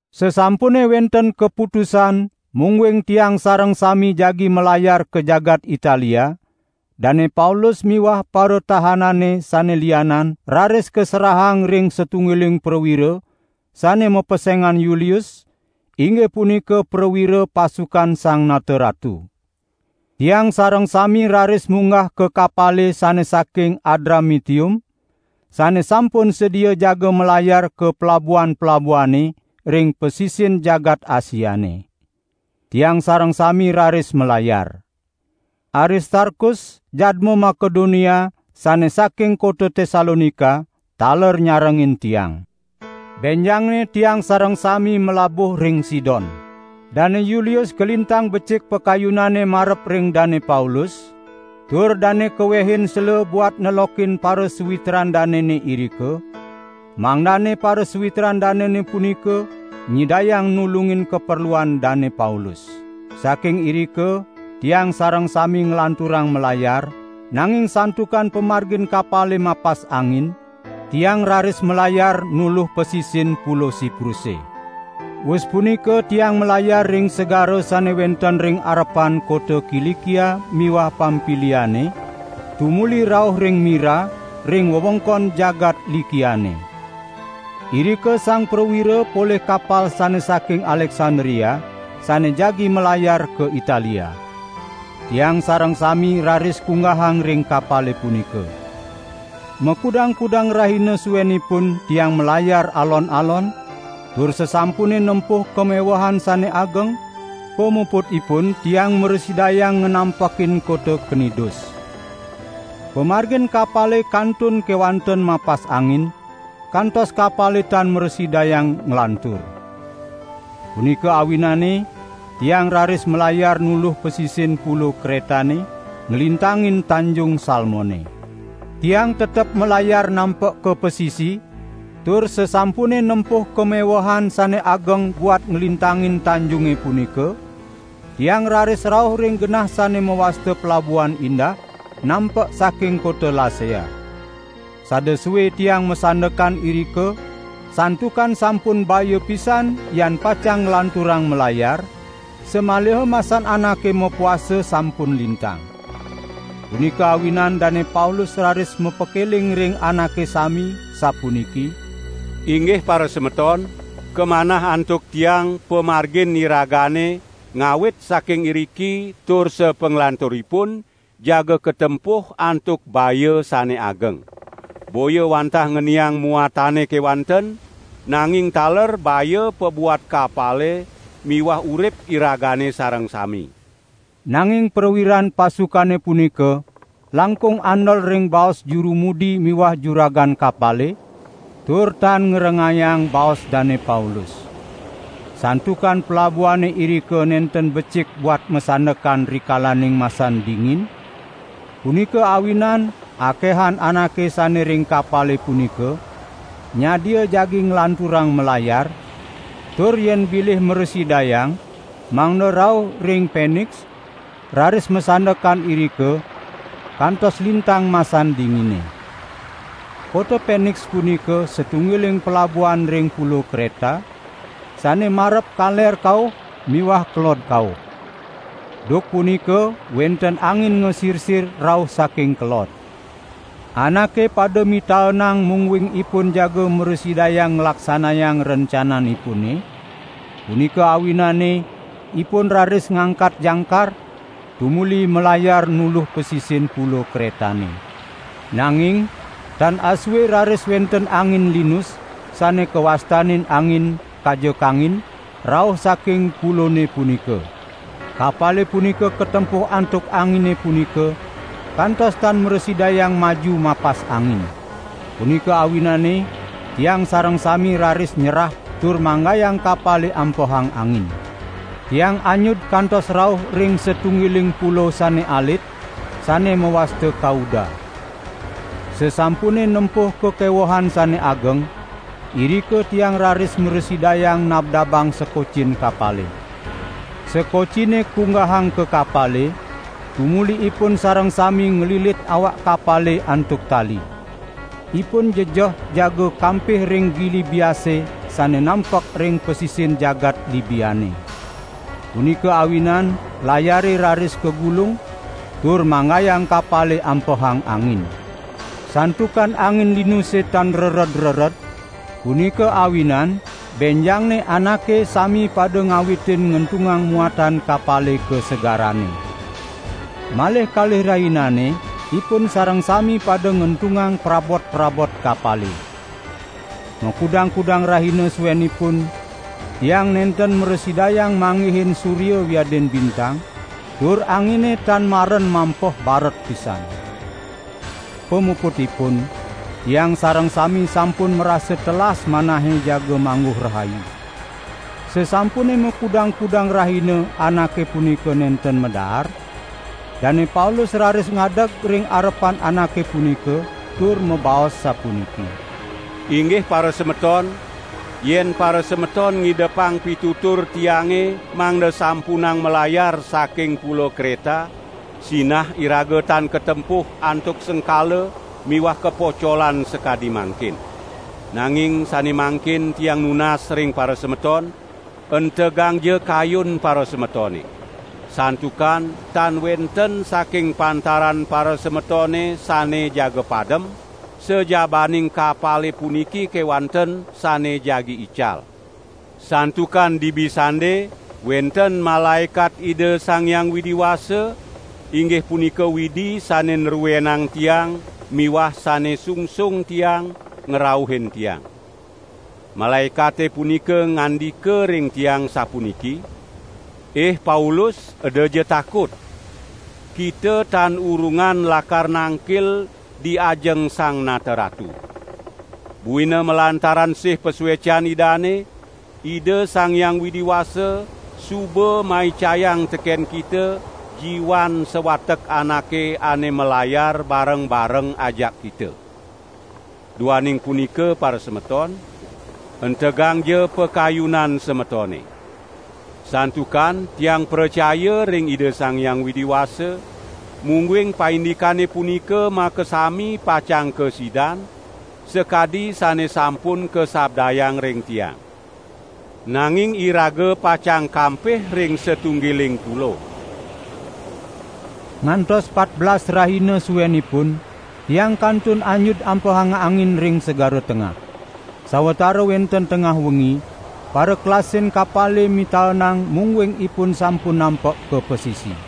Sasampune wenten kaputusan mungguing tiang sareng sami jagi malayar ka jagat Italia, Dane Paulus miwah paratahanane sane lianan raris kaserahang ring satunggiling prawira sane mapesengan Yulius, inggih punika prawira pasukan Sang Nata Ratu. Tiang sareng sami raris munggah ka kapale sane saking Adramitium, sane sampun sedia jaga malayar ka pelabuhan-pelabuhane, ring pasisin jagat Asiane. Tiang sareng sami raris malayar. Aristarkus, jadma Makedonia sane saking kota Tesalonika taler nyarengin tiang. Benjangne tiang sareng sami malabuh ring Sidon. Dane Yulius kalintang becik pakayunane marep ring Dane Paulus, tur dane kawehin sela buat nelokin parasawitran danene irika, mangdane parasawitran danene punika nyidayang nulungin kaperluan Dane Paulus. Saking irika tiang sareng sami nglanturang malayar, nanging santukan pamargin kapale mapas angin, tiang raris malayar nuluh pasisin Pulo Sipruse. Wus punika tiang malayar ring segara sane wenten ring arepan kota Kilikia miwah Pampiliane tumuli rauh ring Mira, ring wewengkon jagat Likiane. Irika sang prawira polih kapal sane saking Aleksandria sane jagi malayar ka Italia. Tiang sareng sami raris kunggahang ring kapale punika. Makudang-kudang rahina suenipun tiang malayar alon-alon, tur sasampune nempuh kamewehan sane ageng, pamuputipun tiang mrasidayang nganampekin kota Knidus. Pamargin kapale kantun kewanten mapas angin, kantos kapale tan mrasidayang nglantur. Punika awinane tiang raris malayar nuluh pasisin Pulo Kretane, nglintangin Tanjung Salmone. Tiang tetep malayar nampek ka pasisi, tur sasampune nempuh kamewehan sane ageng buat nglintangin tanjunge punika, tiang raris rauh ring genah sane mawasta Pelabuhan Indah, nampek saking kota Lasea. Sada sue tiang masandekan irika, santukan sampun baya pisan yan pacang nglanturang malayar, samaliha masan anake mapuasa sampun lintang. Punika awinan Dane Paulus raris mapakeling ring anake sami, sapuniki: "Inggih parasemeton, kamanah antuk tiang pamargin iragane ngawit saking iriki tur sapanglanturipun jaga katempuh antuk baya sane ageng. Boya wantah ngeniang muatane kewanten, nanging taler baya pabuat kapale miwah urip iragane sareng sami." Nanging prawiran pasukane punika langkung andel ring baos juru mudi miwah juragan kapale, tur tan ngrengayang baos Dane Paulus. Santukan pelabuhane irika nenten becik buat masandekan rikalaning masan dingin, punika awinan akehan anake sane ring kapale punika nyadia jagi nglanturang malayar, tur yen bilih mrasidayang mangda rauh ring Peniks, raris masandekan irika kantos lintang masan dingine. Kota Peniks punika satunggiling pelabuhan ring Pulo Kreta, sane marep kaler kauh miwah kelod kauh. Duk punika wenten angin ngasirsir rauh saking kelod. Anake pada mitaenang mungguing ipun jaga mrasidayang nglaksanayang rencananipune, punika awinane ipun raris ngangkat jangkar, tumuli malayar nuluh pasisin Pulo Kretane. Nanging tan asue raris wenten angin linus, sane kawastanin angin "Kaja Kangin", rauh saking pulone punika. Kapale punika katempuh antuk angine punika, kantos tan mrasidayang maju mapas angin. Punika awinane tiang sareng sami raris nyerah tur manggayang kapale ampehang angin. Tiang anyud kantos rauh ring satunggiling pulo sane alit, sane mawasta Kauda. Sasampune nempuh kakewehan sane ageng, irika tiang raris mrasidayang nabdabang sekocin kapale. Sekocine kunggahang ka kapale, tumuli ipun sareng sami nglilit awak kapale antuk tali. Ipun jejeh jaga kampih ring gili biase sane nampek ring pasisin jagat Libiane. Punika awinan layare raris kagulung, tur manggayang kapale ampehang angin. Santukan angin linuse tan rered-rered, punika awinan benjangne anake sami pada ngawitin ngentungang muatan kapale ka segarane. Malih kalih rahinane ipun sareng sami pada ngentungang prabot-prabot kapale. Makudang-kudang rahina suenipun tiang nenten mrasidayang manggihin surya wiadin bintang tur angine tan maren mampeh baret pisan. Pamuputipun tiang sareng sami sampun marasa telas manahe jaga mangguh rahayu. Sasampune makudang-kudang rahina anake punika nenten madaar, Dane Paulus raris ngadeg ring arepan anake punika tur mabaos sapuniki: "Inggih parasemeton, yen parasemeton ngidepang pitutur tiange, mangda sampunang malayar saking Pulo Kreta, sinah iraga tan katempuh antuk sengkala miwah kapocolan sakadi mangkin. Nanging sane mangkin tiang nunas ring parasemeton, entegangja kayun parasemetone. Santukan tan wenten saking pantaran parasemetone sane jaga padem, sajabaning kapale puniki kewanten sane jagi ical. Santukan dibi sande wenten malaekat Ida Sang Hyang Widi Wasa, inggih punika Widi sane nruenang tiang miwah sane sungsung tiang, ngrauhin tiang. Malaekate punika ngandika ring tiang sapuniki: 'Ih Paulus edaja takut! Kita tan urungan lakar nangkil di ajeng Sang Nata Ratu. Buina malantaran sih pasuecan Idane, Ida Sang Hyang Widi Wasa suba maicayang teken kita jiwan sawatek anake ane malayar bareng-bareng ajak kita.' Duaning punika parasemeton, entegangja pakayunan semetone. Santukan tiang pracaya ring Ida Sang Hyang Widi Wasa, mungguing paindikane punika makasami pacang kasidan, sakadi sane sampun kasabdayang ring tiang. Nanging iraga pacang kampih ring satunggilang pulo." Ngantos patbelas rahina suenipun, tiang kantun anyud ampehang angin ring Segara Tengah. Sawatara wenten tengah wengi parakelasin kapale mitaenang mungguing ipun sampun nampek ka pasisi.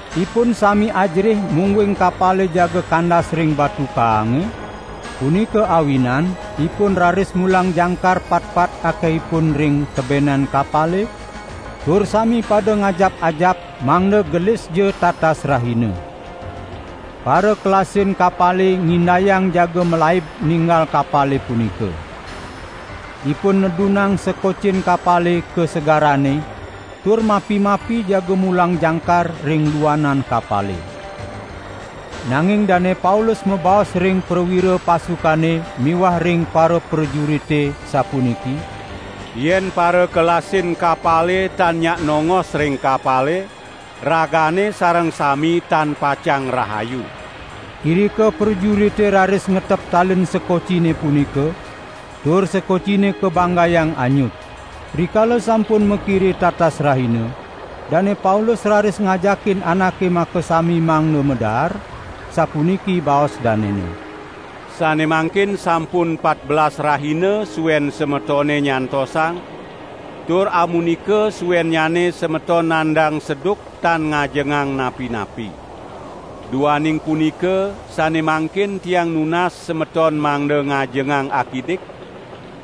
Ipun sami ajerih mungguing kapale jaga kandas ring batu kaange, punika awinan ipun raris mulang jangkar patpat akehipun ring tebenan kapale, tur sami pada ngajap-ajap mangda gelisja tatas rahina. Parakelasin kapale ngindayang jaga malaib ninggal kapale punika. Ipun nedunang sekocin kapale ka segarane tur mapi-mapi jaga mulang jangkar ring luanan kapale. Nanging Dane Paulus mabaos ring prawira pasukane miwah ring paraprajurite, sapuniki: "Yen parakelasin kapale tan nyak nongos ring kapale, ragane sareng sami tan pacang rahayu." Irika prajurite raris ngetep talin sekocine punika, tur sekocine kabanggayang anyud. Rikala sampun makire tatas rahina, Dane Paulus raris ngajakin anake makasami mangda madaar, sapuniki baos danene: "Sane mangkin sampun patbelas rahina suen semetone nyantosang, tur amunika suennyane semeton nanang seduk tan ngajengang napi-napi. Duaning punika sane mangkin tiang nunas semeton mangda ngajengang akidik,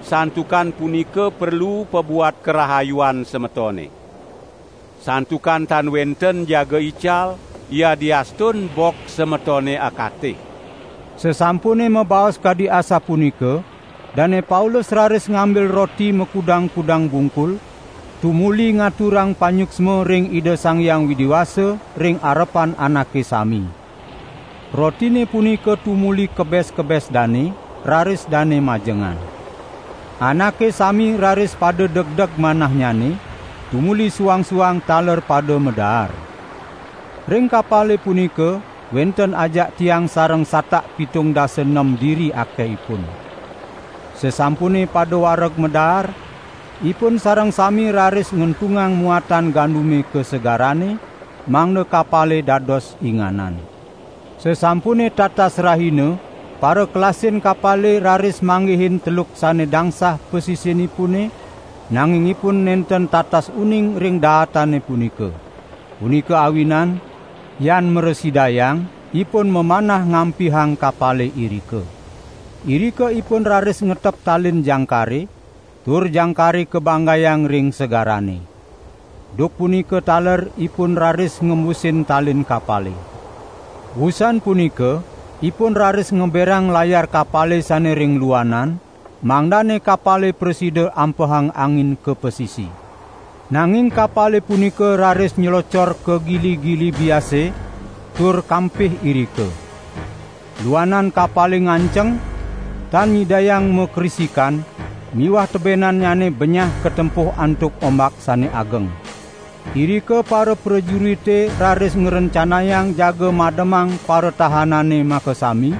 santukan punika perlu pabuat karahayuan semetone. Santukan tan wenten jaga ical, yadiastun bok semetone akatih." Sasampune mabaos kadi asapunika Dane Paulus raris ngambil roti makudang-kudang bungkul, tumuli ngaturang panyuksma ring Ida Sang Hyang Widi Wasa ring arepan anake sami. Rotine punika tumuli kebes-kebes dane, raris dane majengan. Anake sami raris pada degdeg manahnyane, tumuli suang-suang taler pada madaar. Ring kapale punika wenten ajak tiang sareng satak pitung dasa nem diri akehipun. Sasampune pada wareg madaar, ipun sareng sami raris ngentungang muatan gandume ka segarane, mangda kapale dados inganan. Sasampune tatas rahina parakelasin kapale raris manggihin teluk sane dangsah pasisinipune nanging ipun nenten tatas uning ring daatane punika. Punika awinan, yan mrasidayang ipun mamanah ngampihang kapale irika. Irika ipun raris ngetep talin jangkare, tur jangkare kabanggayang ring segarane. Duk punika taler ipun raris ngembusin talin kapale. Wusan punika ipun raris ngeberang layar kapale sane ring luanan mangdane kapale prasida ampehang angin ka pasisi. Nanging kapale punika raris nylocor ka gili-gili biase tur kampih irika. Luanan kapale nganceng, tan nyidayang makrisikan miwah tebenannyane benyah katempuh antuk ombak sane ageng. Irika paraprajurite raris ngrencanayang jaga mademang paratahanane makasami,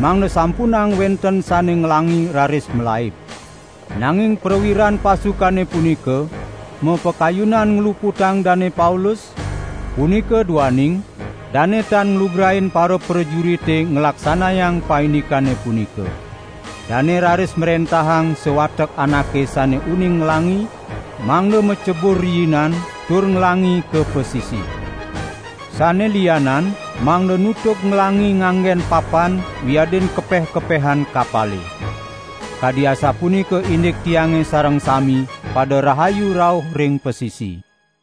mangda sampunang wenten sane nglangi raris malaib. Nanging prawiran pasukane punika mapakayunan ngluputang Dane Paulus, punika duaning dane tan nglugrain paraprajurite nglaksanayang paindikane punika. Dane raris mrentahang sawatek anake sane uning nglangi, mangda macebur riinan tur nglangi ka pasisi. Sane lianan mangda nutug nglangi nganggen papan wiadin kepeh-kepehan kapale. Kadi asapunika indik tiange sareng sami pada rahayu rauh ring pasisi.